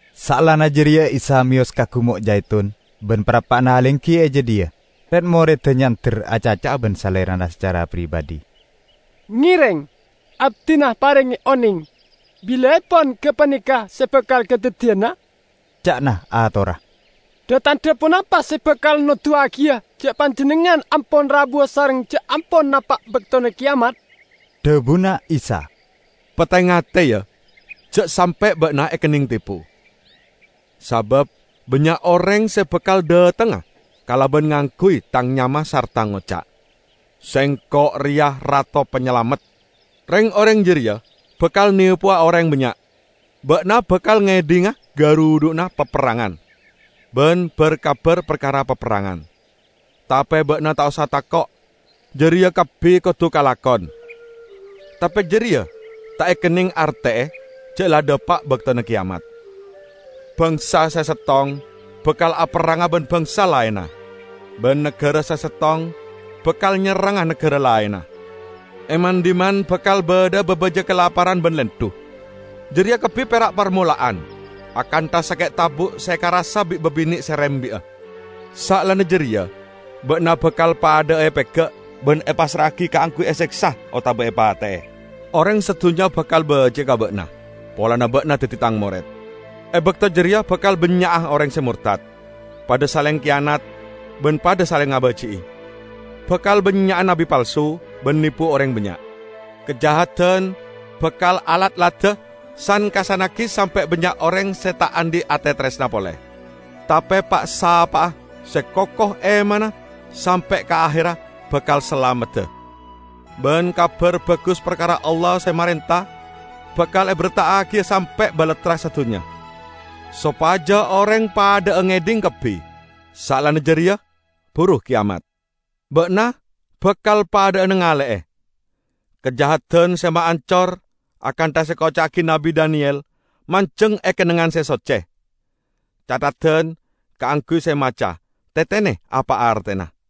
Saellana jareya Isa meyos ka Gumo' Jaitun, ban parappa'na alenggi e jadhiya, red-moredda nyander acaca'a ban Salerana sacara pribadhi. "Ngereng abdina parenge oneng bilaepon gapaneka se bakal kadaddiyana," ca'na atorra. "Dha-tandha ponapa se bakal noduwagiya ja' Panjennengngan ampon rabuwa sareng ja' ampon napa' baktona keyamat?" Dhabuna Isa, "Pate-ngate, ya, ja' sampe' ba'na ekenneng tepo. Sabab bannya' oreng se bakal dhatengnga kalaban ngangguy Tang nyama sarta ngoca', 'Sengko' reya Rato Panyalamet!' Reng-oreng jareya bakal nepowa oreng bannya'. Ba'na bakal ngedhinga garudhu'na paperrangan ban bar-kabar parkara paperrangan, tape ba'na ta' osa tako'. Jareya kabbi kodu kalakon, tape jareya ta' ekenneng arte'e ja' la dhapa' baktona keyamat. Bangsa se settong bakal aperranga ban bangsa laenna, ban nagara se settong bakal nyerranga nagara laenna. E man-dhimman bakal badha'a babaja kalaparan ban lendhu. Jareya kabbi pera' parmola'an, akantha sake' tabu' se ekarassa bi' babine' se rembi'a. Saellana jareya ba'na bakal padha'a epega' ban epassra'agi kaangguy eseksa otaba epate'e. Oreng sadunnya bakal baji'a ka ba'na polana ba'na daddi Tang mored. E bakto jareya bakal bannya'a oreng se mortad, padha saleng kiyanat ban padha saleng ngabaji'i. Bakal bannya'a nabbi palsu, ban nepo oreng bannya'. Kajahadan bakal alatlada san-kassannagi sampe' bannya' oreng se ta' andhi' ate taresna pole. Tape pa'-sapa'a se koko emanna sampe' ka aherra, bakal salamedda. Ban Kabar Bagus parkara Allah se marenta bakal eberta'agiya sampe' balattra sadunnya, sopaja oreng padha'a ngedhing kabbi. Saellana jareya buru keyamat." "Ba'na bakal padha'a nangale'e 'Kajahadan se maancor' akantha se ekoca'agi Nabbi Daniyel, manjeng e kennengngan se socce. (Catheddan kaangguy se maca: Tetene apa artena!)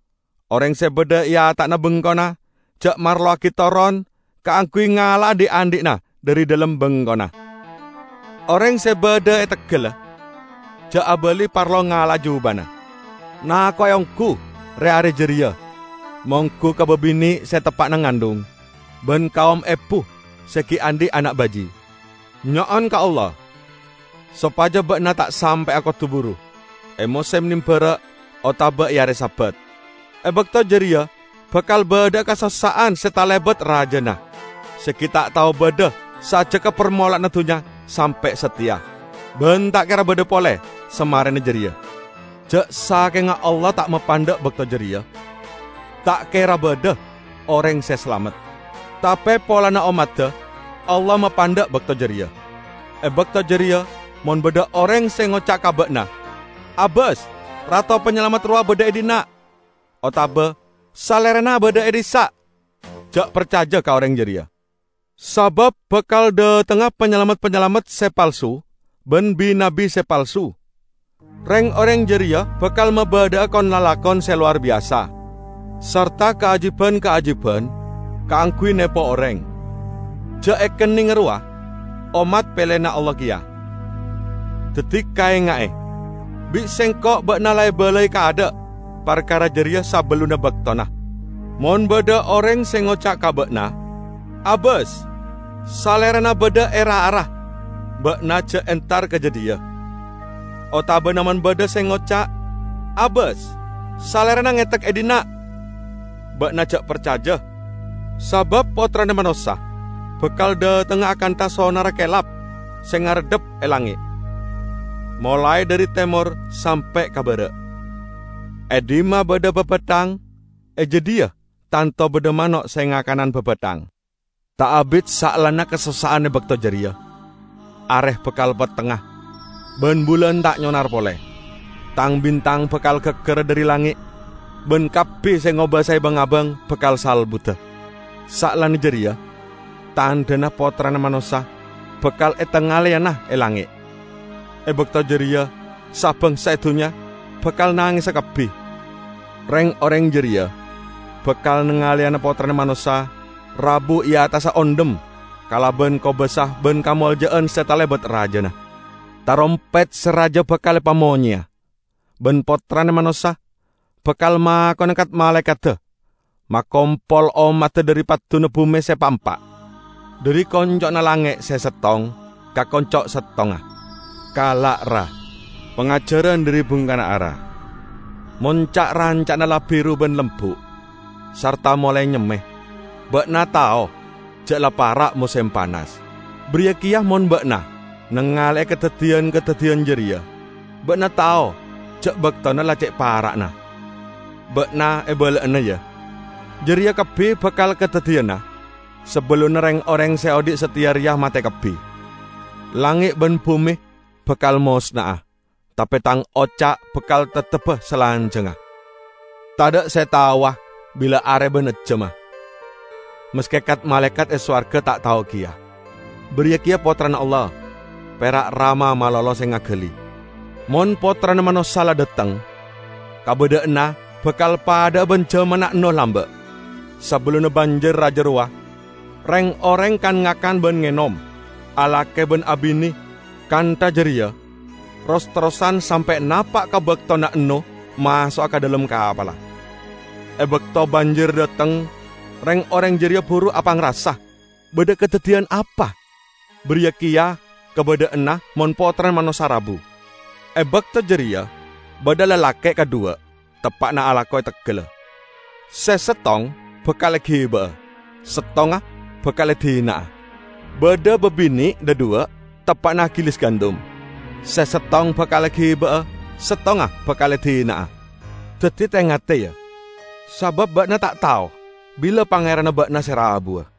Oreng se badha e ata'na bengkona ja' marlowagi toron kaangguy ngala'a dhi'-andhi'na dhari dhalem bengkona. Oreng se badha e teggalla ja' abali parlo ngala'a jubana. Nako'e onggu re-are jareya monggu ka babine' se teppa'na ngandhung ban kaom ebu se gi' andhi' ana' baji'! Nyo'on ka Allah sopaja ba'na ta' sampe'a kodu buru e mosem nambara' otaba e are Sabat! E bakto jareya bakal badha'a kasossa'an se talebat rajana se gi' ta' tao badha sajjegga parmola'anna dunnya sampe' sateya, ban ta' kera badha pole samarena jareya. Ja' sakenga Allah ta' mapandha' bakto jareya; ta' kera badha oreng se salamet. Tape polana ommadda Allah mapandha' bakto jareya. E bakto jareya mon badha oreng se ngoca' ka ba'na, 'Abas, Rato Panyalamet rowa badha e dhinna'!' otaba 'Salerana badha e dhissa'!' -- ja' parcaja ka oreng jareya. Sabab bakal dhatengnga panyalamet-panyalamet se palsu ban bi-nabbi se palsu. Reng-oreng jareya bakal mabadha'a kon-lalakon se lowar biyasa, sarta kaajiban-kaajiban kaangguy nepo oreng, ja' ekennenga rowa, ommat peleyanna Allah keya. Daddi kaenga'e! Bi' Sengko' ba'na la ebalai kaadha' parkara jareya sabellunna baktona. Mon badha oreng se ngoca' ka ba'na, 'Abas, salerana badha e ra-ara!' -- ba'na ja' entar ka jadhiya. Otabana mon badha se ngoca', 'Abas, salerana ngetek e dhinna'!' -- ba'na ja' parcaja. Sabab Pottrana Manossa bakal dhatengnga akantha sonarra kelap se ngareddhap e langnge', molae dhari temor sampe' ka bara'. E dhimma badha babathang, e jadhiya tanto badha mano' se ngakanan babathang." "Ta' abit saellana kasossa'an e bakto jareya, are bakal pettengnga, ban bulan ta' nyonar pole. Tang-bintang bakal gaggara dhari langnge', ban kabbi se ngobasae bang-abang bakal salbuda. Saellana jareya tandhana Pottrana Manossa bakal etangaleyana e langnge'. E bakto jareya sa-bangsa e dunnya bakal nangesa kabbi. Reng-oreng jareya bakal nangaleyana Pottrana Manossa rabu e attassa ondhem kalaban kobasa ban kamolja'an se talebat rajana. Tarompet se raja bakal epamonyeya ban Pottrana Manossa bakal makona kat-malaekadda makompol ommadda dhari padduna bume se pa'-empa', dhari konco'na langnge' se settong ka konco' settongnga." "Kala', ra, pangajaran dhari bungkana ara. Mon ca'-ranca'na la biru ban lembu', sarta molae nyemme, ba'na tao ja' la para' mosem panas. Bariya keya mon ba'na nangale'e kadaddiyan-kadaddiyan jareya, ba'na tao ja' baktona la ce' para'na. Ba'na ebala'ana, ya! Jareya kabbi bakal kadaddiyana sabellunna reng-oreng se odhi' sateya reya mate kabbi. Langnge' ban bume bakal mosna'a, tape Tang oca' bakal teptebba salanjangnga." "Tadha' se taowa bila are ban ejjamma, maske kat-malaekat e sowarga ta' tao keya, bariya keya Pottrana Allah, pera' Rama malolo se ngagali. Mon Pottrana Manossa la dhateng, kabadha'anna bakal padha'a ban jamanna Ennoh lamba'. Sabellunna banjir raja rowa, reng-oreng kan-ngakan ban ngenom, alake ban abine. Kantha jareya ros-terrosan sampe' napa' ka baktona Ennoh maso'a ka dhalem kapalla. E bakto banjir dhateng, reng-oreng jareya buru apangrasa badha kadaddiyan apa. Bariya keya kabadha'anna mon Pottrana Manossa rabu. E bakto jareya badha lalake' kadhuwa teppa'na alako e teggalla: se settong bakal egiba'a, settongnga bakal edina'a. Badha babine' dhadhuwa' teppa'na agilis gandum: Se settong bakal egiba'a, settongnga bakal edina'a. Daddi te-ngate, ya, sabab ba'na ta' tao bila Pangeranna ba'na se rabuwa.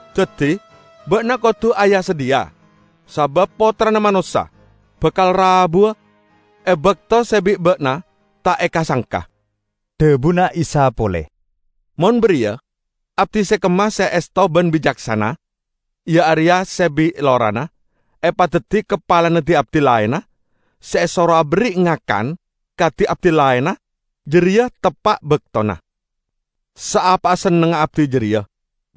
Daddi, ba'na kodu aya-sadhiya. Sabab Pottrana Manossa bakal rabuwa e bakto se bi' ba'na ta' eka-sangka." Dhabuna Isa pole, "Mon bariya, abdi se kemma se esto ban bicaksana? Iya areya se bi' lorana epadaddi kapalana di-abdi laenna, se esoro aberri' ngakan ka di-abdi laenna jareya teppa' baktona. Saapa sennengnga abdi jareya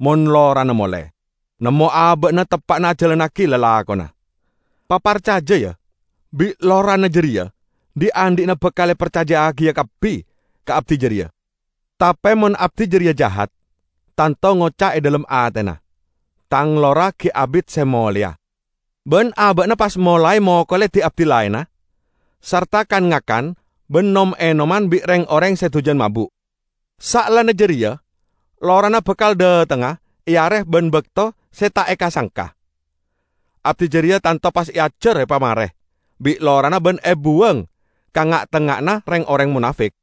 mon lorana mole, nemmo aba'na teppa'na ajalannagi lalakonna. Paparcaja, ya, bi' lorana jareya dhi'-andhi'na bakal eparcaja'agiya kabbi ka abdi jareya. Tape mon abdi jareya jahat, tanto ngoca' e dhalem atena, 'Tang lora gi' abit se moleya,' ban aba'na pas molae mokole di-abdi laenna, sarta kan-ngakan ban nom-enoman bi' reng-oreng se dujan mabu'. Saellana jareya lorana bakal dhatengnga e are ban bakto se ta' eka-sangka. Abdi jareya tanto pas eajar epamare bi' lorana ban ebuwang ka nga'-tengnga'anna reng-oreng monafik.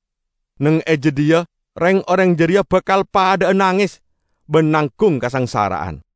Neng e jadhiya reng-oreng jareya bakal padha'a nanges ban nanggung kasangsara'an."